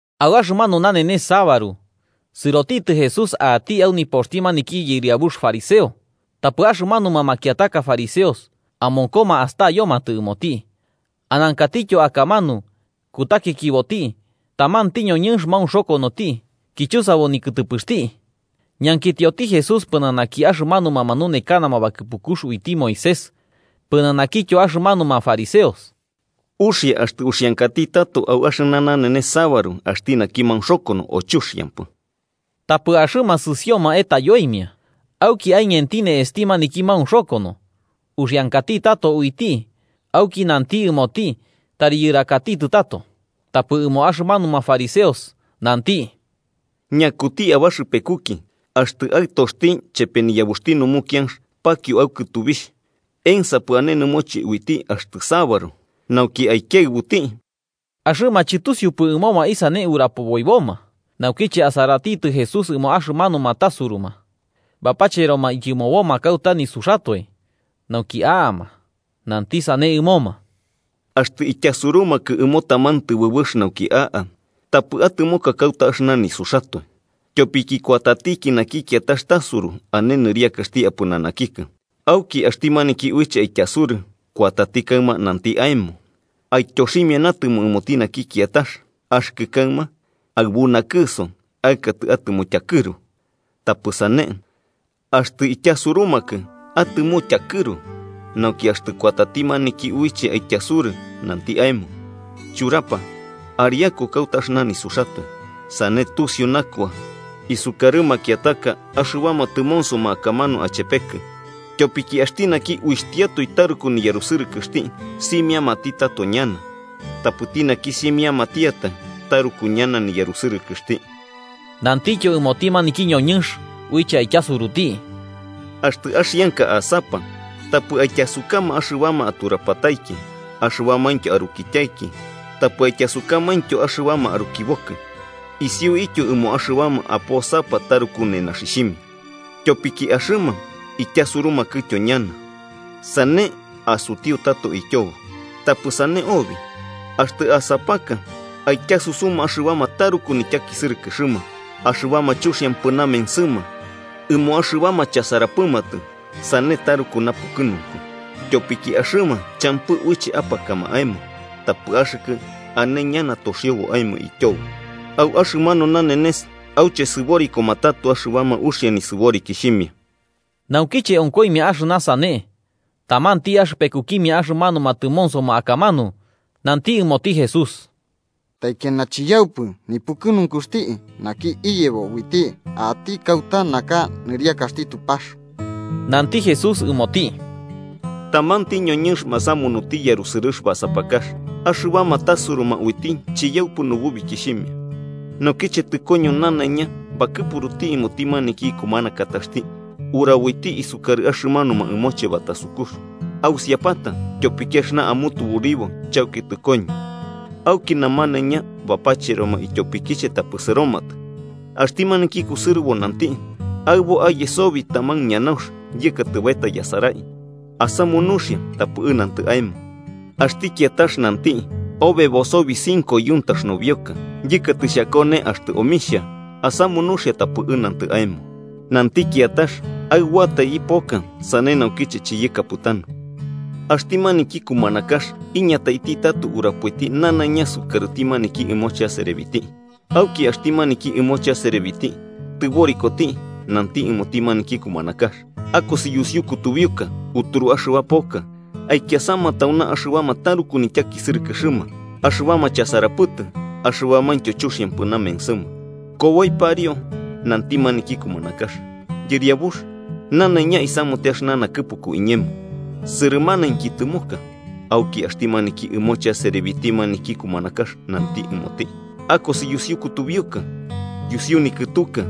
Au axɨmanu nanenes sabaru sɨrotitɨ Jesús a'ati au nipoxti maniki yɨriabux fariseo, tapɨ axɨmanuma makiataka fariseos amonkoma astayomatɨ ɨmoti. Anankatityo akamanu, kutakikiboti, tamanti ñoñɨnx maunxokonoti kichusabo nikɨtɨpɨxti. Ñankitioti Jesús pɨnanaki axɨmanuma manunekanama bakɨpukux uiti Moisés pɨnanakityo axɨmanuma fariseos: –¿Uxia axtɨ kuraboti au axɨna nanenes sabaru axti naki maunxokono, o chuxiampɨ? Tapɨ axɨma sɨsioma etayoimia. Auki aiñenti ne'esti maniki maunxokono, uxiankati tato uiti auki nanti ɨmoti tari yɨrakatitɨ tato. Tapɨ ɨmo axɨmanuma fariseos nanti: –¿Ñakuti abaxɨpekuki, axtɨ aɨtoxti chepe niyabuxti numukianx pakio au kɨtubixh, ensapɨ ane nɨmoche uiti axtɨ sabaru nauki aikiɨbuti? Axɨma chɨtusiupɨ ɨmoma isane urapoboiboma. Naukiche asaratitɨ Jesús ɨmo axɨmanuma tasuruma bapacheroma ityɨmoboma kauta nisuxatoe nauki a'ama, nanti sane ɨmoma: 8–Axtɨ ityasurumakɨ ɨmo taman tɨbɨbɨx nauki a'a, tapɨ atɨmoka kauta axɨna nisuxatoe, tyopiki kuatatiki naki kiatax tasuru ane nɨriakaxti apɨnanakikɨ. Auki axti maniki uiche aityasuruti año kuatati kaɨma nanti aemo: ‘Aityoximia natɨmo ɨmoti naki kiatax.’ Axɨkɨ kaɨma aɨbu nakɨso aɨkatɨ atɨmo tyakɨru. Tapɨ sane, axtɨ ityasurumakɨ, atɨmo tyakɨru, nauki axtɨ kuatati maniki uiche aityasurɨ, nanti aemo: ‘Churapa, ariaku kauta axɨna nisuxatoe.’ Sane tusiu nakua isukarɨ makiataka axɨbama tɨmonsoma akamanu achepekɨ. Tyopiki axti naki uixhtiatoe taruku niyarusɨrɨkɨxti, simiamati tato ñana. Tapɨti naki simiamantiatai, taruku ñana niyarusɨrɨkɨxti. Nantityo ɨmoti maniki ñoñɨnx uiche aityasuruti: –Axtɨ axianka asapa, tapɨ aityasukama axɨbama aturapataiki, axɨbamaintyo arukityaiki, tapɨ aityasukamaintyo axɨbama arukibokɨ, isiuityo ɨmo axɨbama aposapa taruku nenaxixhimia. Tyopiki axɨma, ityasurumakɨtyo ñana, sane asutiu tato ityobo. Tapɨ sane obi, axtɨ asapaka, aityasusuma axɨbama taruku nityakisɨrɨkɨxɨma, axɨbama chuxiampɨ namensɨma, ɨmo axɨbama chasarapɨmatɨ. Sane taruku napukɨnunku. Tyopiki axɨma champɨ uiche apakama aemo, tapɨ axɨkɨ ane ñana toxiobo aemo ityobo au axɨmanu nanenes auche sɨborikoma tato axɨbama uxia nisɨborikixhimia. Naukiche onkoimia axɨna sane, tamanti axɨpekukimia axɨmanuma tɨmonsoma akamanu nanti ɨmoti Jesús: –¡Taikiana chiyaupɨ nipukɨnunkuxti naki iyebo uiti a'ati kauta naka nɨriakaxti Tupax! Nanti Jesús ɨmoti: –Tamanti ñoñɨnx masamunuti yarusɨrɨx basapakax, axɨbama tasuruma uiti chiyaupɨ nububikixhimia. Naukiche tɨkoño nanaiña bakɨpuruti ɨmoti maniki ikumanakataxti uraboiti sukarɨ axɨmanuma ɨmoche batasukux: ‘Ausiapata, tyopiki axɨna amutuburibo chauki tɨkoño.’ Auki namanaiña bapacheroma ityopikiche tapɨ sɨromatɨ. Axti maniki kusɨrɨbo nanti: ‘Aɨbo aye sobi taman ñanaunx, yɨkatɨ baeta yasarai. Asamu nuxia tapɨ ɨnantɨ aemo.’ Axti kiatax nanti: ‘Obebo sobi cinco yuntax nobioka, yɨkatɨ xhakone axtɨ omixhia. Asamu nuxia tapɨ ɨnantɨ aemo.’ Nanti kiatax: ‘Aɨboatai ipoka, sane naukiche chiyɨkapɨtanu.’ Axti maniki kumanakax iñataiti tato urapoiti nanaiña sukarɨti maniki ɨmoche aserebiti. Auki axti maniki ɨmoche aserebiti tɨborikoti, nanti ɨmoti maniki kumanakax: ‘Akosi yusiu kutubiuka uturu axɨba poka, aikiasama tauna axɨbama taruku nityakisɨrɨkɨxɨma, axɨbama chasarapɨtɨ axɨbamaintyo chuxiampɨ namensɨma.’ Koboi pariu, nanti maniki kumanakax: ‘Yɨriabux, nanaiña isamute axɨna nakɨpuku iñemo, sɨrɨmanainki tɨmoka.’ Auki axti maniki ɨmoche aserebiti maniki kumanakax nanti ɨmoti: ‘Akosi yusiu kutubiuka yusiu nikɨtuka,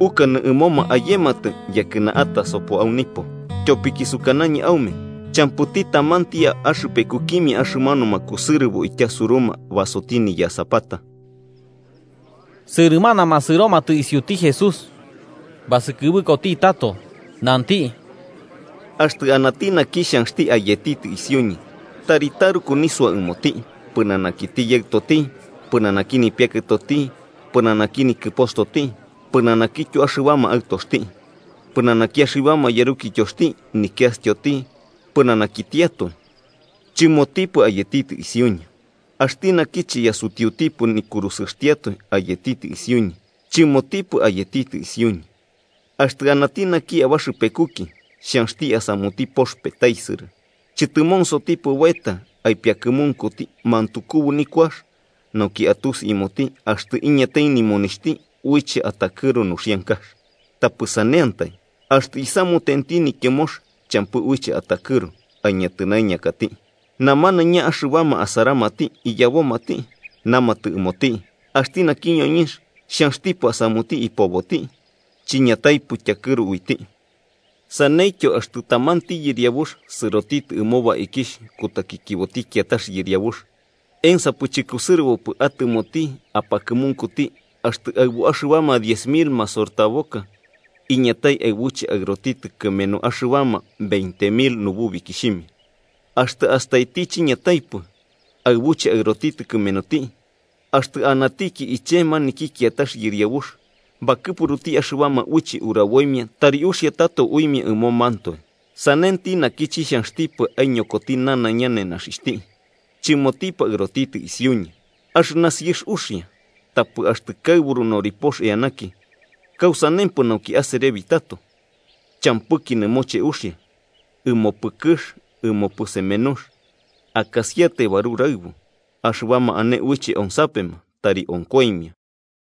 ukanɨ ɨmoma ayematɨ, yakɨna atasopo au nipo. Tyopiki sukanañɨ aume champɨti tamanti axɨpekukimia axɨmanuma kusɨrɨbo ityasuruma basoti niyasapata.’ Sɨrɨmanama sɨromatɨ isiuti Jesús. Basɨkɨbɨkoti tato nanti: “Axtɨ anati naki xhanxti ayetitɨ isiuñɨ tari taruku nisua ɨmoti pɨnanakiti yaɨtoti, pɨnanaki nipiakɨtoti, pɨnanaki nikɨpostoti, pɨnanakityo axɨbama aɨtoxti, pɨnanaki axɨbama yarukityoxti nikiastyoti, pɨnanakitiatoe, chɨmotipɨ ayetitɨ isiuñɨ. Axti naki chiyasutiutipɨ nikurusɨxtiatoe ayetitɨ isiuñɨ, chɨmotipɨ ayetitɨ isiuñɨ. Axtɨ anati naki abaxɨpekuki xhanxti asamuti pox petaisɨrɨ, ¿chɨtɨmonsotipɨ baeta aipiakɨmunkuti mantukubu nikuax, nauki atusi ɨmoti axtɨ iñatai nimonixhti uiche atakɨru nuxiankax? Tapɨ saneantai, axtɨ isamutenti nityɨmox champɨ uiche atakɨru aiñatɨnaiñakati, namanaiña axɨbama asaramati iyabomati, namatɨ ɨmoti: ‘Axti naki ñoñɨnx xhanxtipɨ asamuti ipoboti, chiñataipɨ tyakɨru uiti.’ Saneityo axtɨ tamanti yɨriabux sɨrotitɨ ɨmo baikixh kutakikiboti kiatax yɨriabux, ¿ensapɨ chɨkusɨrɨbopɨ atɨmoti apakɨmunkuti axtɨ aɨbu axɨbama diez mil masortaboka iñatai aɨbuche aɨrotitɨ kɨmenu axɨbama veinte mil nububikixhimia? Axtɨ astaiti chiñataipɨ aɨbuche aɨrotitɨ kɨmenuti, axtɨ anatiki iche maniki kiatax yɨriabux, bakɨpuruti axɨbama uiche uraboimia tari uxia tato uimia ɨmomantoe. Sanenti naki, chixhanxtipɨ aiñokoti nanaiña nenaxixhti, chɨmotipɨ aɨrotitɨ isiuñɨ. “Axɨna siɨx uxia. Tapɨ axtɨ kaɨburu noripox eanaki, ¿kausanempɨ nauki aserebi tato? Champɨki nɨmoche uxia ɨmopɨ kɨx ɨmopɨ semenux. Akasiatai baruraɨbu. Axɨbama ane uiche onsapema, tari onkoimia.”